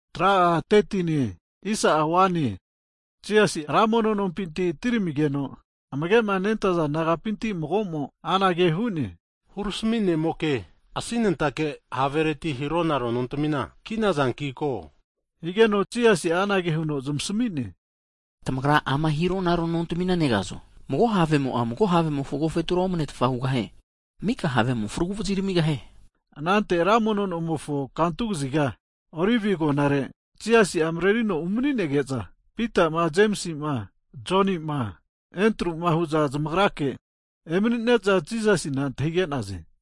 Hagi Jisasi'ma Ra mono nompinti atiramigeno'a, amage'ma nentaza disaipol nagapinti mago'mo'a anage hu'ne, Hurami ne'moke, asinentike havereti'ma hiro naro nontamina ki'nazanki ko! Higeno Jisasi'a anage huno zamasami'ne, Tamagra ama hironaro nontami negazo? Mago havemo'a, mago havemofo agofetura omane'tfa hugahie. Mika havemo'a fragu vazi ramigahie. Anante ra mono nomofo kantu kaziga, Olive agonare Jisasi'a marerino umaninege'za, Pita'ma, Jemisi'ma, Joni'ma, Endru'ma hu'za zamagrake emanine'za Jisasina amanage hu'za antahige'naze.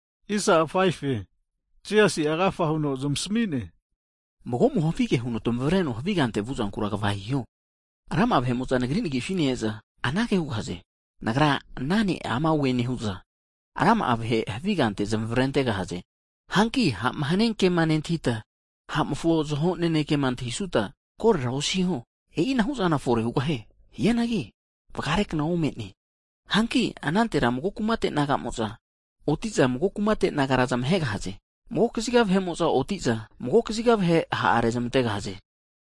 Hazageno Jisasi'a agafa huno zamasami'ne, Mago'mo havige huno tamavareno havi kante vu'zankura, kva hiho. Rama'a vahe'mo'za Nagri nagifi ne-eza anage hugahaze, nagra ana ne' ama'i neoe nehu'za, rama'a vahe havi kante zamavrentegahaze. Hanki ha'ma hania kema nentahita, ha'mofo zaho nanekema antahisanuta korora osiho. E'ina hu'zana fore hugahie. Hianagi vagare kna ome'ne. Hanki anantera mago kumate naga'mo'za, oti'za mago kumate nagara zamahegahaze. Mago kaziga vahe'mo'za oti'za, mago kaziga vahera ha' rezmantegahaze.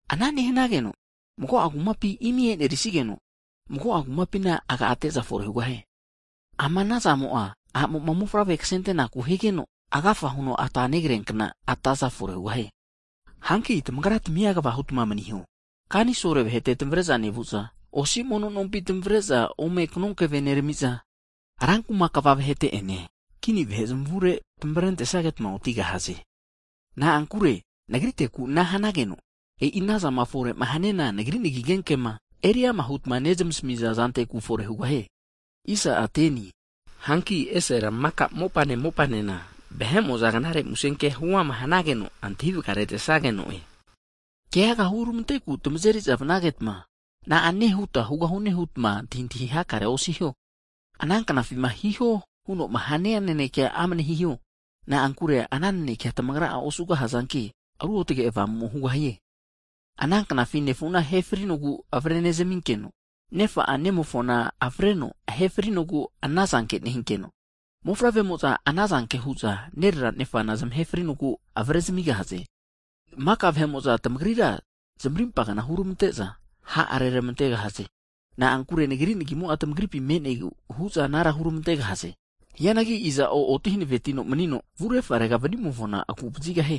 Ana nehanageno mago'a kumapina imi e'nerisigeno, mago'a kumapina agate'za fore hugahie. Ama ana zamo'a, a'mo'ma mofavre kasentenaku higeno, agafa huno ata negriankna ataza fore hugahie. Hanki tamagratamia kva hutma maniho. Kanisolo vahete tamavare'za nevu'za, osi mono nompinti tamavre'za kanonkeve ome nerami'za, rankuma kva vahete'ene kini vahe zamavure tamavrentesageta otigahaze. Na'ankure nagriteku ana hanageno, e'i anazama fore'ma haniana nagri musenkema eri'ama hutma nezmasami'za zanteku fore hugahie. Hanki esera maka mopane mopanena vahe'mo'za Knare Musenkea huama hanageno antahi vagaretesageno'e. Hagi keaga hurmanteku tamazeri'za vanagetma, na'ane huta hugahune hutma antahintahi hakarea osiho. Ana knafima hiho huno'ma hania nanekea amane hiho. Na'ankure ana nanekea tamagra'a osugahazanki, Ruotage Avamumo hugahie. Ana knafi nefuna ahe frinogu avare nezaminkeno, nefa'a nemofona avreno ahe frinogu ana zanke nehinkeno, mofavremo'za ana zanke huza nerera nefana zamahe frinogu avare zamigahaze. Maka vahe'mo'za tamagrira zamarimpa kna huneramante'za ha' reramantegahaze. Na'ankure Nagri nagimo'a tamagripi me'negu hu'za anara huramante'gahaze. Hianagi iza'o oti hanavetino manino vu refarega vanimofona agu vazigahie.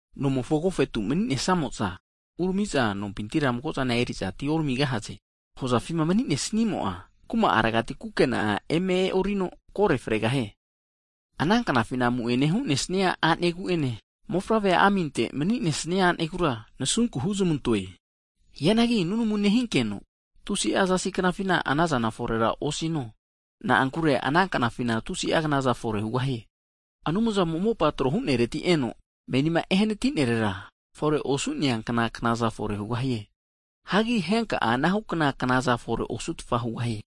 Nomofo agofetuma mani'nesamo'za, uramiza nompintira mago'a zana eriza atioramigahaze. Hozafima mani'ne snimo'a, kuma'aregati nakre ku'a eme e'orino. Ananknafima amu'ene hu'nesnia a'negu'ene, mofavre aminte mani'nesnia a'negura, nasunku huzmantoe. Hianagi nunamuna nehinkeno, tusi'a zasi knafina anazana forera osino. Na'ankure ananknafina tusi'a knaza fore hugahiankino, Anumzamo'ma mopama tro hu'nereti eno menima ehanatinerera, fore osu'neankna knaza fore hugahie. Hagi henka'a ana hukna knazana fore osutfa hugahie.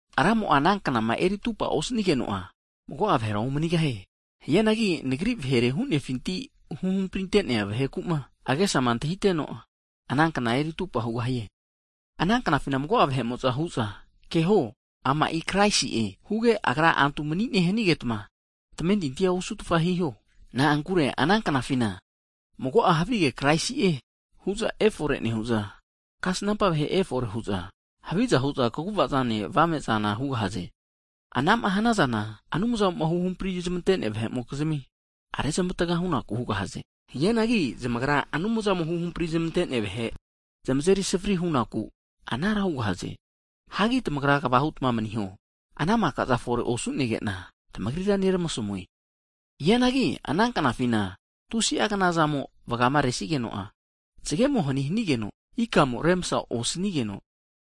Ramo'a ana knama eri atupa osanigeno'a, mago'a vahera omanigahie. Hianagi Nagri vahere huno hunefinti huhampri'nea vahekuma agesama antahiteno, ana kna eri atupa hugahie. Ana knafi mago'a vahe'mo'za hu'za, keho ama'i kraisi'e huge, agra antu mani'ne hanagetma tamentintia osutfa hiho! Na'ankure ana knafina mago'a havige kraisi'e huza efore nehu'za, kasnampa vahe efore hu'za, haviza hu'za kagu'vazane avame'za hugahaze. Anama hanazana Anumzamo'ma huhampri zmante'nea vahe'mokizmi, rezmataga hu'naku hugahaze. Hianagi zamagra Anumzamo'ma huhampri zamante'nea vahe'ma zamazeri savari hu'nakuma hanuza anara hugahaze. Hagi tamagra kva hutma maniho! Ana maka'zana fore osunege'na, tamagrira neramasamue. Hianagi ana knafina tusi'a knazamo vagama resigeno'a, zagemo hani hanigeno, ikamo'a remsa osanigeno,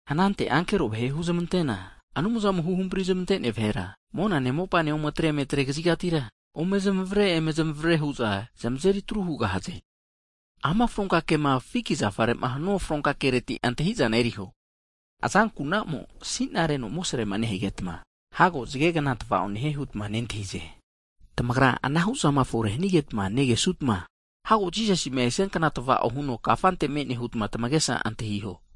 Anante ankero vahe'a huzmantena, Anumzamo huhampri zamante'nea vahera mona mopa ome tre emetre kazigatira ome zmavare eme zmavare hu'za zamazeri atru hugahaze. Ama fronka kema fiki zafare'ma hanua fronka kereti antahi'zana eriho. Azanku'namo asinareno amosrema nehegetma, hago zagegna tava'o nehie hutma nentahize. Hagi tamagra anahu zama fore'ma hanigetma negesnutma, hago Vahe'mofo Mofavre esia kna'a tava'o huno kafante me'ne hutma tamagesa antahiho.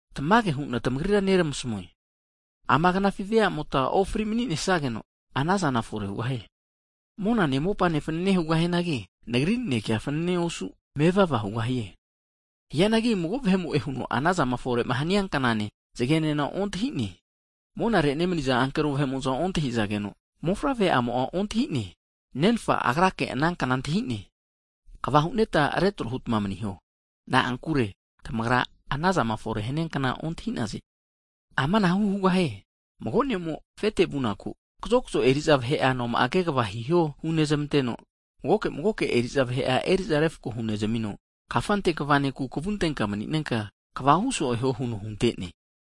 Tamage hu'na tamagrira neramasamue. Ama knafi veamota ofri mani'nesnageno, ana zana fore hugahie. Monane mopane fanane hugahianagi, Nagri nanekemo'a fanane osu mevava hugahie. Hianagi mago vahe'mo'e huno anazama fore'ma hania knane zagenena ontahi'ne. Monare nemaniza ankero vahe'mo'za ontahi'zageno, Mofavre'amo'a ontahi'ne. Nefa Agrake ana kna antahi'ne. Kva hunetma retro hutma maniho. Na'ankure tamagra anazama efore'ma hania kna ontahi'naze. Amanahu hugahie, mago ne'mo afete vunaku, kazokzo eriza vahe'a noma'a kegava hiho hunezmanteno, magoke magoke eri'za vahe'a eri'za refko hunezamino, kafante kva nekura kavu antenka maninenka kva hu so'e huo huno hunte'ne.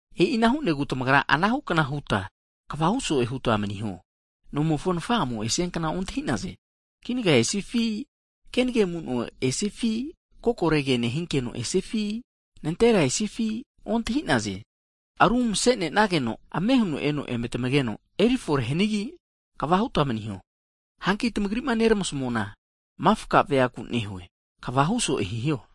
E'ina hu'negu tamagra anahu kna huta, kva hu so'e huta maniho. Nomofo nafa'amo esnia kna ontahi'naze. Kinaga esifi, kenage amu'no esifi, kokore ke nehinkeno esifi, nantera esifi ontahi'naze. Aru masenenageno, ame huno eno eme tamageno eri fore hanigi, kva hutma maniho. Hanki tamagri'ma neramasmuana mifka veaku nehue. Kva huso'e hiho.